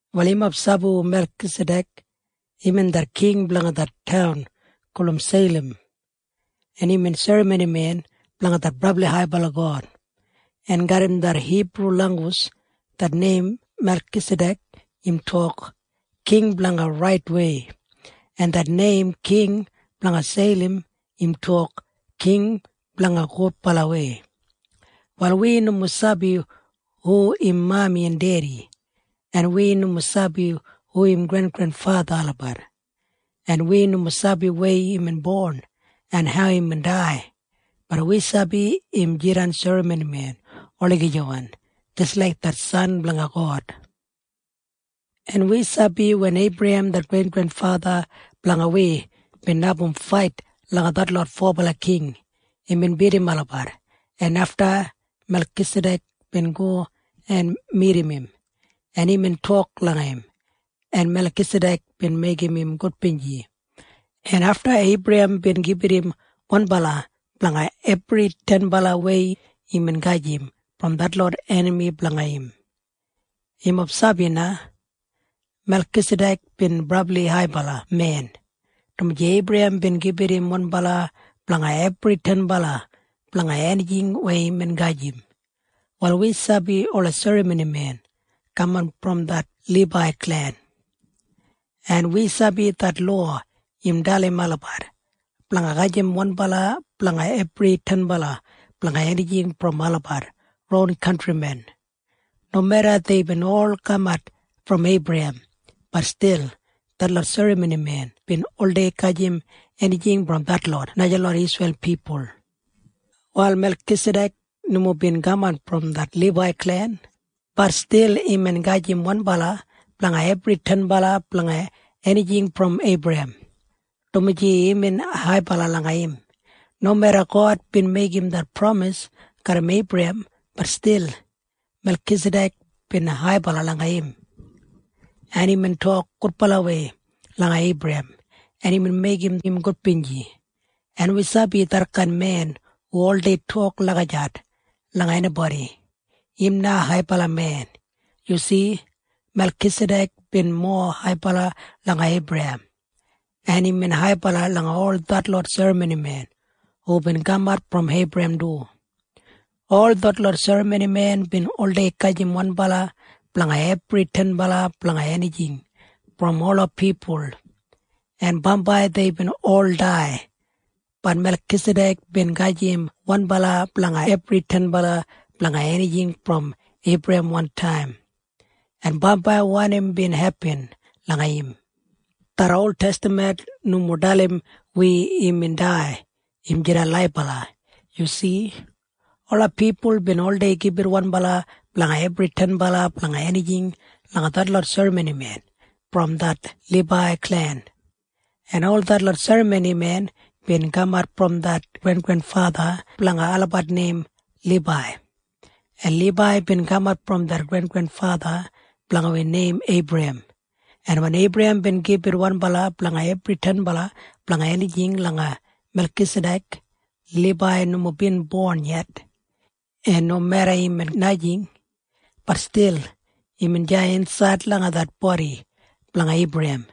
Wal yumob sabi hu Melkisadek? Imbin det king blanga det taun gulum Seilam, en imbin serramonimen blanga det brabli haibala God, en garram det Hibru langgus det neim Melkisadek im tok, “King blanga Raitwei”. En det neim King blanga Seilam im tok, “King blanga Gudbalawei”. Wal wi nomo sabi hu im mami en dedi, en wi nomo sabi hu im grengrenfatha olabat, en wi nomo sabi weya imbin bon en hau imbin dai. Bat wi sabi im jidan serramonimen olagijawan jis laik det San blanga God. En wi sabi wen Eibrahem det grengrenfatha blanga wi bin abum fait langa detlot fobala king, imbin bidim olabat. Afta Melkisadek bin go en midim im, en imbin tok langa im en bin meigim im gudbinji. En afta Eibrahem bin gibit im wanbala ting blanga ebri tenbala enijing weya imbin gajim brom detlot enami blanga im. Yumob sabi na? Melkisadek bin brabli haibala men, dumaji Eibrahem bin gibit im wanbala ting blanga ebri tenbala enijing weya imbin gajim. Wal wi sabi ola serramonimen kaman brom det Libai klen, en wi sabi det lowa im dalim olabat blanga gajim wanbala ting blanga ebri tenbala enijing brom olabat ron kantrimen. Nomeda deibin ol kamat brom Eibrahem, bat stil detlot serramonimen bin oldei gajim enijing brom detlot najalot Isreil pipul. Wal Melkisadek nomo bin kaman brom det Libai klen. Bat stil imbin gajim wanbala ting blanga ebri tenbala enijing brom Eibrahem, dumaji imbin haibala langa im. Nomeda God bin meigim det pramis garram Eibrahem, bat stil Melkisadek bin haibala langa im, en imbin tok gudbalawei langa Eibrahem, en imbin meigim im gudbinji. En wi sabi detkain men hu oldei tok lagijat langa enibodi, im na haibala men. Yu si? Melkisadek bin mowa haibala langa Eibrahem, en imbin haibala langa ol detlot serramonimen hubin kamat brom Eibrahem du. Ol detlot serramonimen bin oldei gajim wanbala ting blanga ebri tenbala enijing brom ola pipul, en bambai deibin ol dai. Bat Melkisadek bin gajim wanbala ting blanga ebri tenbala enijing brom Eibrahem wantaim, en bambai wanim bin hepin langa im? Det oltestaman nomo dalim wi imbin dai. Im jidan laibala. Yu si? Ola pipul bin oldei gibit wanbala ting blanga ebri tenbala enijing langa detlot serramonimen brom det Libai klen, en ol detlot serramonimen bin kamat brom det grengrenfatha blanga olabat neim Libai, en Libai bin kamat brom det grengrenfatha blanga wi neim Eibrahem, en wen Eibrahem bin gibit wanbala ting blanga ebri tenbala enijing langa Melkisadek, Libai nomo bin bon yet. En nomeda imbin najing, bat stil imbin deya insaid langa det bodi blanga Eibrahem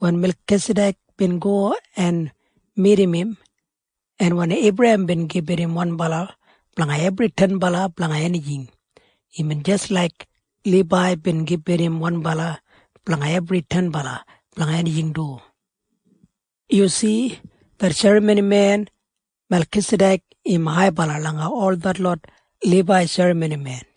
wen Melkisadek bin go en midim im, en wen Eibrahem bin gibit im wanbala ting blanga ebri tenbala enijing, imbin jis laik Libai bin gibit im wanbala ting blanga ebri tenbala enijing du. Yu si? Det serramonimen Melkisadek im haibala langa ol detlot Libai serramonimen.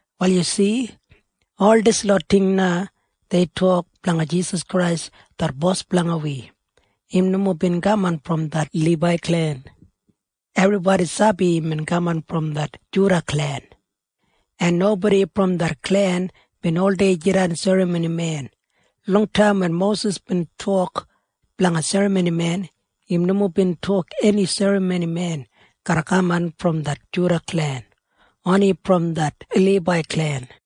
Wal yu si? Ol dislot ting na dei tok blanga Jisas Krais det Bos blanga wi. Im nomo bin kaman brom det Libai klen. Ebribodi sabi imbin kaman brom det Juda klen, en nobodi brom det klen bin oldei jidan serramonimen. Longtaim wen Mosis bin tok blanga serramonimen, im nomo bin tok eni serramonimen garra kaman brom det Juda klen. Oni brom det Libai klen.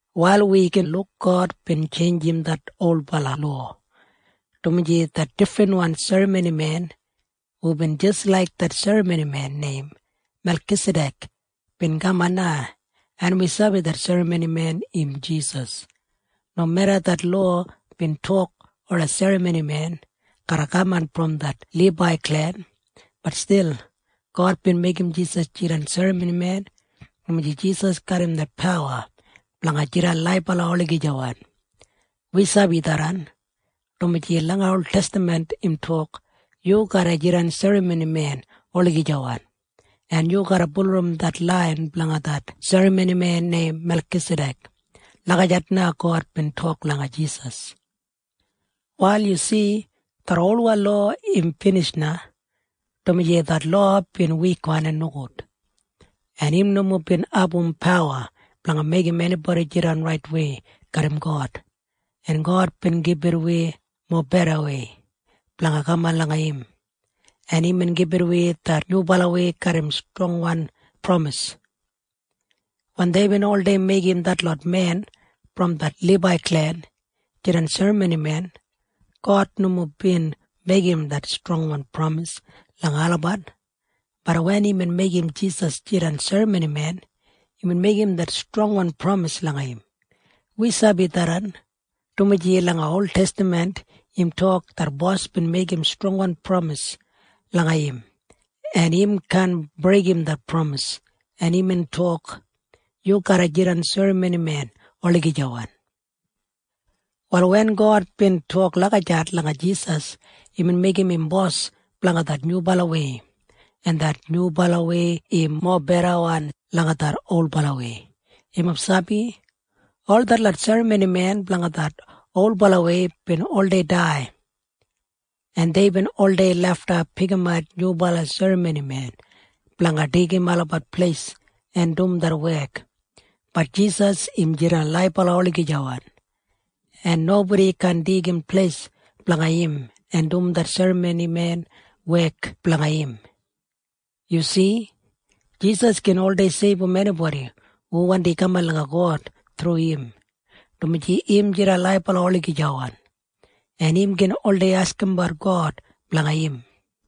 Wal wi gin luk God bin tjeinjim det olbala lowa, dumaji det difrinwan serramonimen hubin jis laik det serramonimen neim Melkisadek bin kaman na, en wi sabi det serramonimen im Jisas. Nomeda det lowa bin tok ola serramonimen garra kaman brom det Libai klen, bat stil God bin meigim Jisas jidan serramonimen, dumaji Jisas garram det pawa blanga jidan laibala olagijawan. Wi sabi tharran, dumaji langa oltestaman im tok, “Yu garra jidan serramonimen olagijawan, en yu garra bulurrum det lain blanga det serramonimen neim Melkisadek.” Lagijat na God bin tok langa Jisas. Wal yu si? Det olwan lowa im binij na, dumaji det lowa bin wikwan en nogud, en im nomo bin abum pawa blanga meigim enibodi jidan raitwei garram God. En God bin gibit wi mobedawei blanga kaman langa im, en imbin gibit wi det nyubalawei garram strongwan pramis. Wen deibin oldei meigim detlot men brom det Libai klen jidan serramonimen, God nomo bin meigim det strongwan pramis langa olabat. Bat wen imbin meigim Jisas jidan serramonimen, imbin meigim det strongwan pramis langa im. Wi sabi tharran, dumaji langa oltestaman im tok, “Det Bos bin meigim strongwan pramis langa im, en im kaan breigim det pramis, en imbin tok, ‘Yu garra jidan serramonimen olagijawan.’” Wal wen God bin tok lagijat langa Jisas, imbin meigim im Bos blanga det nyubalawei, en det nyubalawei im mobedawan langa det olbalawei. Yumob sabi? Ol detlot serramonimen blanga det olbalawei bin oldei dai, en deibin oldei lafta pikimat nyubala serramonimen blanga deigim olabat pleis en dum det wek. Bat Jisas im jidan laibala olagijawan, en nobodi kaan deigim pleis blanga im en dum det serramonimen wek blanga im. Yu si? Jisas gin oldei seibum enibodi hu wandim kaman langa God thru im, dumaji im jidan laibala olagijawan, en im gin oldei askimbat God blanga olabat.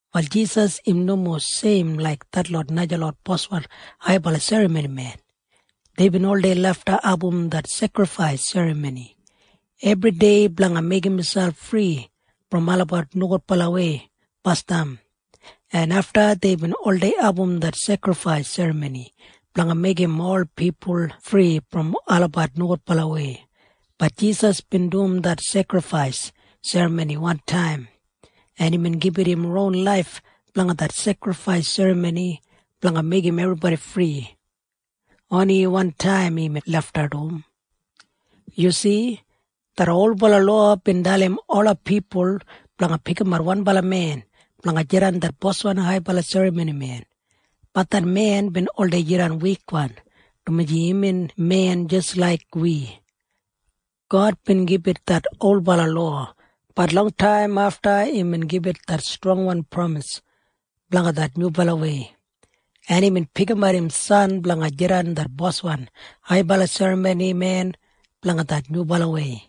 Wal Jisas im nomo seim laik detlot najalot boswan haibala serramonimen. Deibin oldei lafta abum det sekrifais serramoni ebridei blanga meigim miselp fri brom olabat nogudbalawei basdam, en afta deibin oldei abum det sekrifais serramoni blanga meigim ola pipul fri brom olabat nogudbalawei. Bat Jisas bin dum det sekrifais serramoni wantaim, en imbin gibit im ron laif blanga det sekrifais serramoni blanga meigim ebribodi fri. Oni wantaim imbin lafta dum. Yu si? Det olbala lowa bin dalim ola pipul blanga pikimat wanbala men blanga jidan det boswan haibala serramonimen. Bat det men bin oldei jidan wikwan, dumaji imbin men jis laik wi. God bin gibit det olbala lowa. Bat longtaim afta imbin gibit det strongwan pramis blanga det nyubalawei, en imbin pikimat im San blanga jidan det Boswan haibala serramonimen blanga det nyubalawei,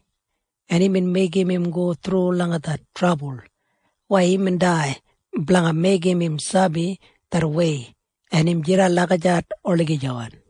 en imbin meigim im go thru langa det trabul weya imbin dai blanga meigim im sabi det wei. En im jidan lagijat olagijawan.